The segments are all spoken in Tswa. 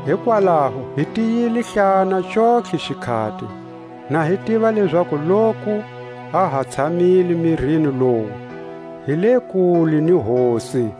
Hikwalaho hi tiyilehlana xontlhe xikhati, na hi tiva lezaku loku ha ha tshamile mirini lowu, hi le kule ni Hosi,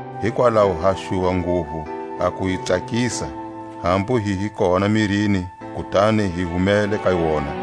Hikwalaho ha xuva nguvu a ku yi tsakisa, hambu hi hi kona mirini kutani hi humele ka wona.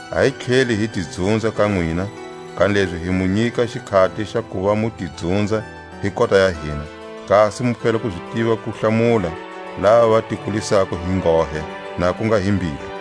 A hi tlheli hi ti dzunza ka nwina, kanilezi hi mu nyika xikhati xa kuva mu ti dzunza hi kota ya hina, kasi mu fela zi tiva ku hlamula lava va ti kulisako hi nghohe, na ku nga hi mbilu.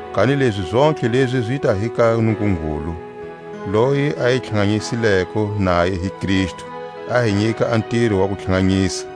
Kanilezi zontlhe lezi zita hi ka Nungungulu, loyi a hi tlhanganyisileko naye hi Kristu, a hi nyika a ntiro wa kutlhanganyisa,